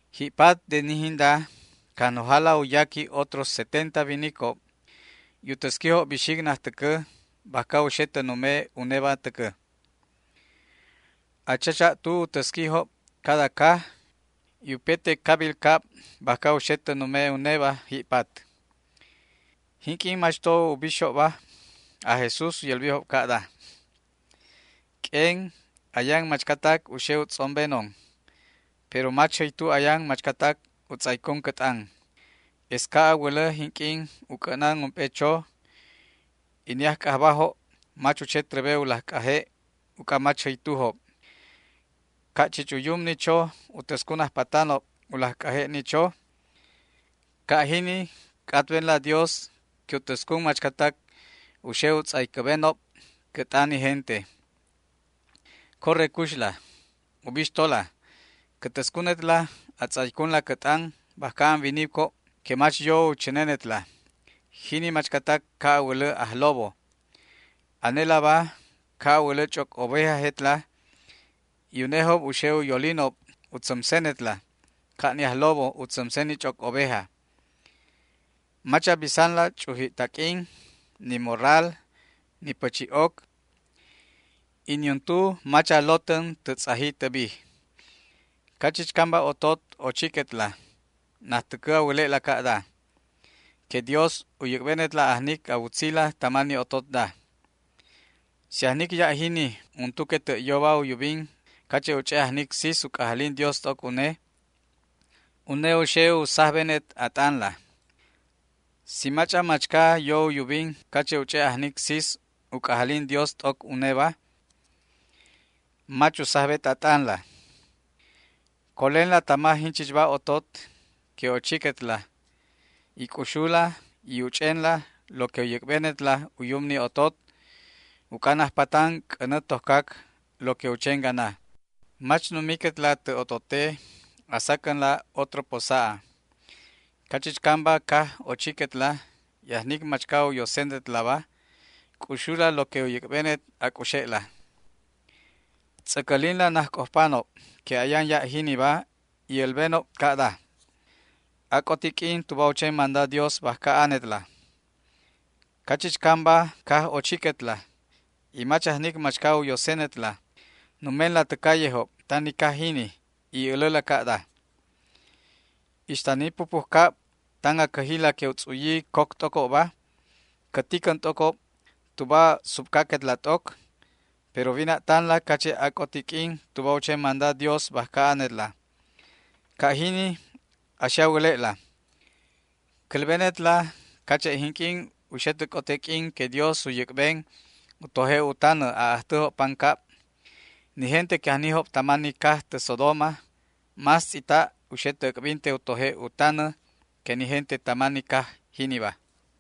Ji'pat de ni jinda Cajnojala u yaqui otros setenta winicob y u täsquijob bixic najtäcä bajca u xe tä nume uneba täcä. A chacha'tu u täsquijob cada caj y upete cabil cab bajca u xe uneba ji'pat. Jinq'uin mach to bixjobba aj Jesús u yälbijob ca'da: ―Q'uen ayan machcatac u xe u tz'ombenon, pero mach jäytu ayan machcatac u tz'aycun cä t'an. Es ca' a wälä jinq'uin u c'ä'nan ump'e cho y ni ajc'ajbajob mach u che trebe u laj c'aje' uc'a mach jäytujob. Ca' chich u yum ni cho u täscun ajpatanob u laj c'aje' ni cho, ca' jini c'atbenla Dios que u täscun machcatac u xe u tz'aycäbenob cä t'an ni gente. Corre cuxla. Ubixtola, cä täscunetla a tz'aycunla cä t'an bajca an winicob que mach yo u chänenetla, jini machcatac ca' a wälä ajlobo. Anelaba ca' a wälä ch'oc ovejajetla y unejob u xe u yolinob u tzämsenetla ca' ni ajlobo u tzämsen ni ch'oc oveja. Mach a bisanla ch'uji' taq'uin, ni morral, ni pächi'oc, y niuntu mach a lotän tä tz'aji tä bij. Cachichcamba otot ochiquetla, najtäcä a wäle'la ca'da: “Que Dios u yäc'benetla ajnic a wutzila tama ni ototda”. Si ajnic ya' jini untu que tä' yoba u yubin cache' u ch'e' ajnic sis u c'ajalin Dios t'oc une, une u xe u sajbenet a t'anla. Si mach'an machca yo u yubin cache' u ch'e' ajnic sis u c'ajalin Dios t'oc uneba, mach u sajbet a t'anla. Colenla tama jinchichba otot que ochiquetla y c'uxula y uch'enla lo que u yäc'benetla u yum ni otot, uc'a najpatan c'änä tojcac lo que u chen gana. Mach numiquetla tä otote a sacänla otro posa'a. Cachichcamba caj ochiquetla y ajnic machca u yosenetlaba, c'uxula lo que u yäc'benet a c'uxe'la. Tz'äcälinla najc'ojpanob que ayan ya' jiniba y älbenob ca'da: “Ac'oti q'uin tuba u chen manda Dios bajca anetla”. Cachichcamba caj ochiquetla y mach ajnic machca u yosenetla, numenla tä callejob tan ni caj jini y äläla ca'da: “Ixta ni pupujcab tan a cäjila que u tz'uyi coc t'ocobba, cä ticän t'ocob tuba subcaquetla t'oc, pero wina'tanla cache' ac'oti q'uin tuba u chen manda Dios bajca anetla”. Ca' jini a xe a wäle'la. Cälbenetla cache' jinq'uin u xe tä c'ote q'uin que Dios u yäc'ben u toje' u tanä a'ajtäjob pancab, ni gente que ajnijob tama ni caj tä Sodoma más tz'ita' u xe tä äc'binte u toje' u tanä que ni gente tama ni caj jiniba.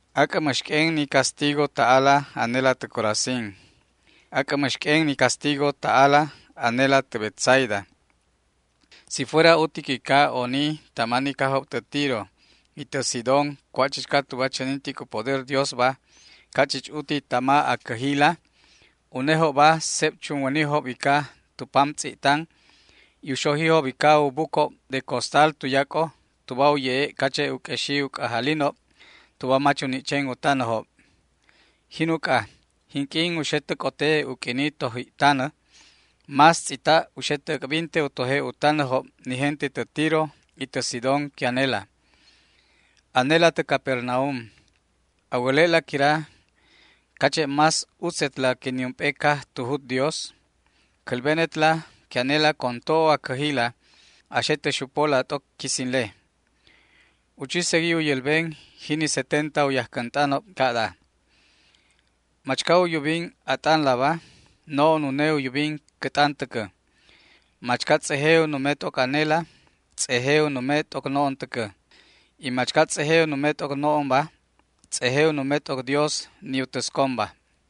’¡Ac'ä mäx q'uen ni castigo ta'ala anela tä Corazín! ¡Ac'ä mäx q'uen ni castigo ta'ala anela tä Betsaida! Si fuera utic ica oni tama ni cajob tä Tiro y tä Sidón cua' chichca tuba chänintic u poder Diosba, ca' chich uti tama a cäjila, unejobba seb chunwänijob ica tu pam tz'i'tan y u xojijob ica u bucob de costal tuyac'o tuba u ye'e' cache' u q'uexi u c'ajalinob tuba mach u ni' chen u tanäjob. Jin uc'a, jinq'uin u xe tä c'ote u q'uini toji'tanä, más tz'ita' u xe tä äc'binte u toje' u tanäjob ni gente tä Tiro y tä Sidón que anela. Anela tä Capernaum, ¿a wäle'la quira cache' más utzetla que niump'e caj tu jut Dios? Cälbenetla que anela con to'o a cäjila a xe tä xupola t'oc quisinle. U chi segui u yälben jini setenta u yajcänt'anob ca'da: ―Machca u yubin a t'anlaba, no'on une u yubin cä t'an täcä. Machca tz'eje u nume t'oc anela, tz'eje u nume t'oc no'on täcä, y machca tz'eje u nume t'oc no'onba tz'eje u nume t'oc Dios, ni u täsconba.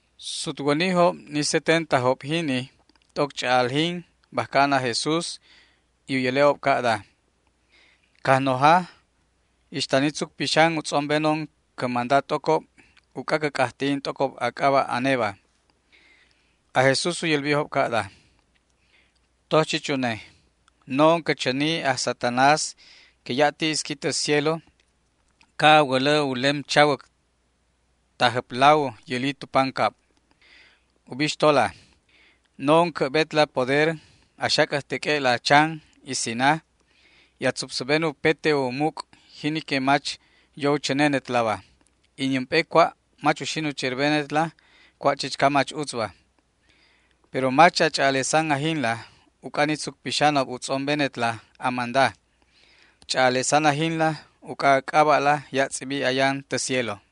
Sutwänijob ni setentajobba jini t'oc ch'a'aljin bajca an aj Jesús y u yäle'ob ca'da: ―Cajnoja, ixta ni tzuc pixan u tz'ombenon cä manda t'ocob uc'a cä c'ajti'in t'ocob a c'aba' aneba. Aj Jesús u yälbijob ca'da: ―Toj chich une, no'on cä chäni chich aj Satanás que ya' ti isqui tä cielo ca' a wälä u lem chawäc tajjäplaw yäli tu pancab. Ubixtola, no'on cä'betla poder a xac'äjteq'ue'la chan y sina, y a tzupsäben upete u muc' jini que mach yo u chänenetlaba, y niump'e cua' mach uxin u cherbenetla cua' chichca mach utzba. Pero mach a ch'a'alesan ajinla uc'a ni tzuc pixanob u tz'ombenetla a manda. Ch'a'alesan ajinla uc'a a c'aba'la ya' tz'ibi ayan tä cielo.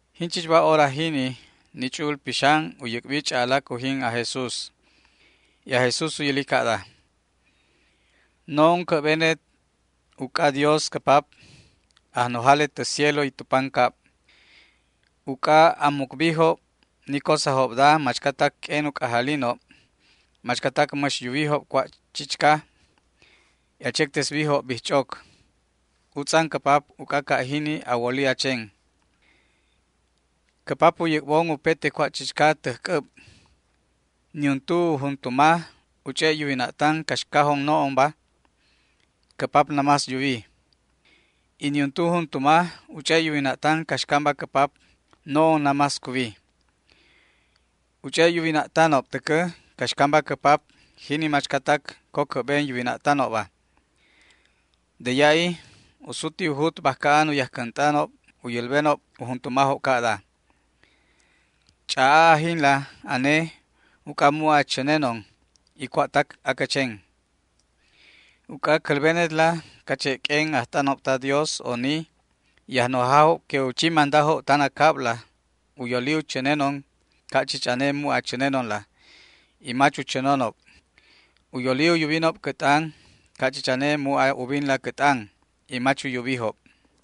Jinchichba hora jini ni Ch'u'ul Pixan u yäc'bi ch'a'alac ujin aj Jesús. Y aj Jesús u yäli ca'da: ―No'on cä'benet uc'adios cä Pap, Ajnojalet tä cielo y tu pancab, uc'a a mucbijob ni cosajobda machcatac q'uen u c'ajalinob, machcatac mäx yuwijob cua' chichca, y a chectesbijob bijch'oc. Utz'an cä Pap, uc'a ca' jini a woli a chen. ’Cä Pap u yäc'bon upete cua' chichca täj c'äb. Niuntu u juntuma u ch'e' yuwina'tan caxcajon no'onba; cä Pap namás yuwi. Y niuntu u juntuma u ch'e' yuwina'tan caxcamba cä Pap; no'on namás cuwi. U ch'e' yuwina'tanob täcä caxcamba cä Pap jini machcatac co cä'ben yuwina'tanobba. De ya'i u suti u jut bajca an u yajcänt'anob u yälbenob u juntumajob ca'da: ―Ch'a'a ajinla ane uc'a mu' a chänenon y cua'tac acä chen. Uc'a cälbenetla cache' q'uen ajt'anob ta Dios oni y ajnojajob que u chi mandajob tan a cabla u yolijob u chänenon ca' chich ane mu' a chänenonla y mach u chänonob. U yoli u yubinob cä t'an ca' chich ane mu' a ubinla cä t'an y mach u yubijob.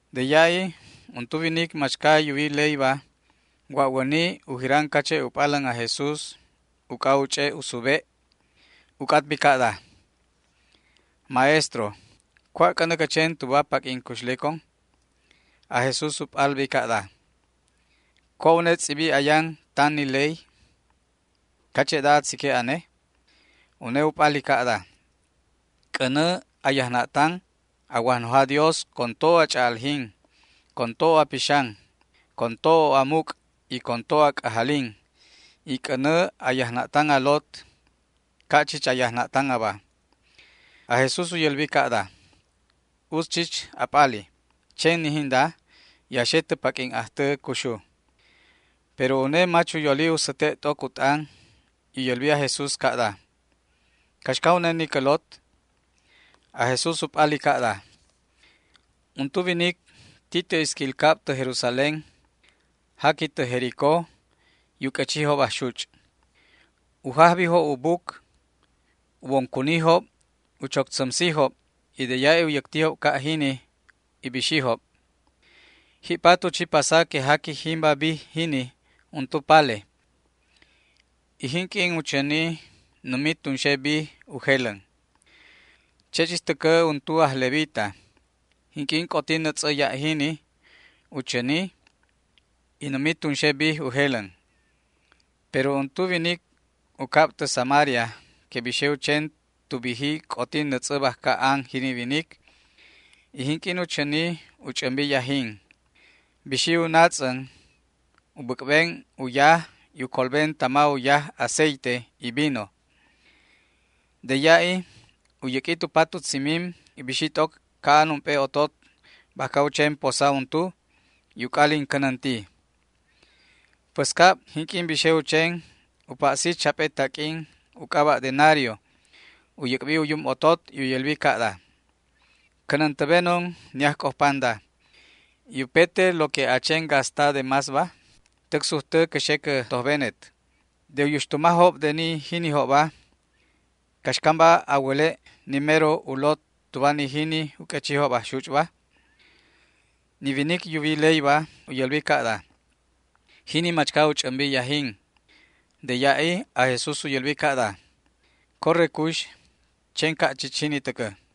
De ya'i untu winic machca yuwi leyba, wa'wäni u jiran cache' u p'alän aj Jesús uc'a u ch'e' u sube'. U c'atbi ca'da: ―Maestro, ¿cua' c'änä cä chen tuba paq'uin cuxlecon? Aj Jesús u p'albi ca'da: ―¿Cua' une tz'ibi ayan tan ni ley? ¿Cache'da a tzique' ane? Une u p'ali ca'da: ―“C'änä a yajna'tan a Wajnoja Dios con to'o a ch'a'aljin, con to'o a pixan, con to'o a muc' y con to'o a c'ajalin, y c'änä a yajna'tan a lot ca' chich a yajna'tan aba”. Aj Jesús u yälbi ca'da: ―Utz chich a p'ali. Chen ni jinda, y a xe tä paq'uin ajtä cuxu. Pero une mach u yoli u säte' t'oc u t'an y u yälbi aj Jesús ca'da: ―¿Caxca une ni cä lot? Aj Jesús u p'ali ca'da: ―Untu winic ti tä isquil cab tä Jerusalén, jaqui tä Jericó y u q'uechijob ajxuch'. U jajbijob u buc, u bon cunijob u choc tzämsijob, y de ya'i u yäctijob ca' jini y bixijob. Ji'pat, u chi pasa que jaqui jimba bij jini untu pale, y jinq'uin u chäni, numi tunxe bij u jelän. Che' chich täcä untu aj levita, jinq'uin c'oti nätz'ä ya' jini, u chäni, y numi tunxe bij u jelän. Pero untu winic u cab tä Samaria que bixe u chen tu biji c'oti nätz'ä bajca an jini winic, y jinq'uin u chäni u ch'ämbi yajin. Bixi u natz'än u bäc'ben u yaj y u colben tama u yaj aceite y vino. De ya'i u yäq'ui tu pat u tzimim y bixi t'oc ca'an ump'e otot bajca u chen posa untu y u c'alin cänänti. Päscab jinq'uin bixe u chen u pa'si chap'e taq'uin u c'aba' denario, u yäc'bi u yum otot y u yälbi ca'da: “Cänäntäbenon ni ajc'ojpanda, y upete lo que a chen gasta de másba, täc sujtä cä xe cä tojbenet”. De u yuxtumajob de ni jinijobba, ¿caxcamba a wäle' ni mero u lot tuba ni jini u q'uechijob ajxuch'ba? Ni winic yuwi leyba u yälbi ca'da: ―Jini machca u ch'ämbi yajin. De ya'i aj Jesús u yälbi ca'da: ―Corre cux, chen ca' chich jini täcä.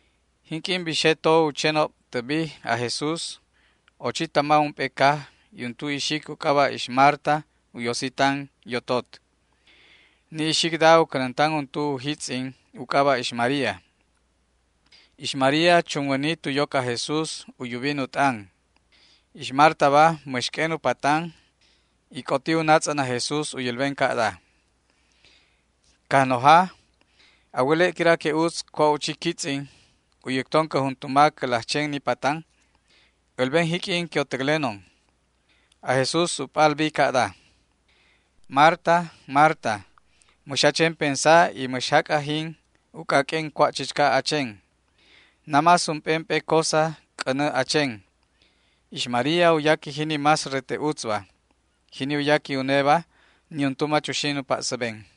Jinq'uin bixe to u chenob tä bij aj Jesús ochi tama ump'e caj y untu ixic u c'aba' ix Marta u yosi tan yotot. Ni ixicda u cänäntan untu u jitz'in u c'aba' ix María. Ix María chunwäni tu yoc aj Jesús u yubin u t'an. Ix Martaba mäx q'uen u patan y c'oti u natz'än aj Jesús u yälben ca'da: ―Cajnoja, ¿a wäle' quira que utz cua' u chi quitz'in, u yäcton cä juntuma cä laj chen ni patan? älben jiq'uin que u täclenon. Aj Jesús u p'albi ca'da: ―Marta, Marta, mäx a chen pensa y mäx jac' ajin uc'a q'uen cua' chichca a chen. Namás ump'emp'e cosa c'änä a chen. Ix María u yaqui jini más rete utzba. Jini u yaqui uneba niuntu mach uxin u pa'säben.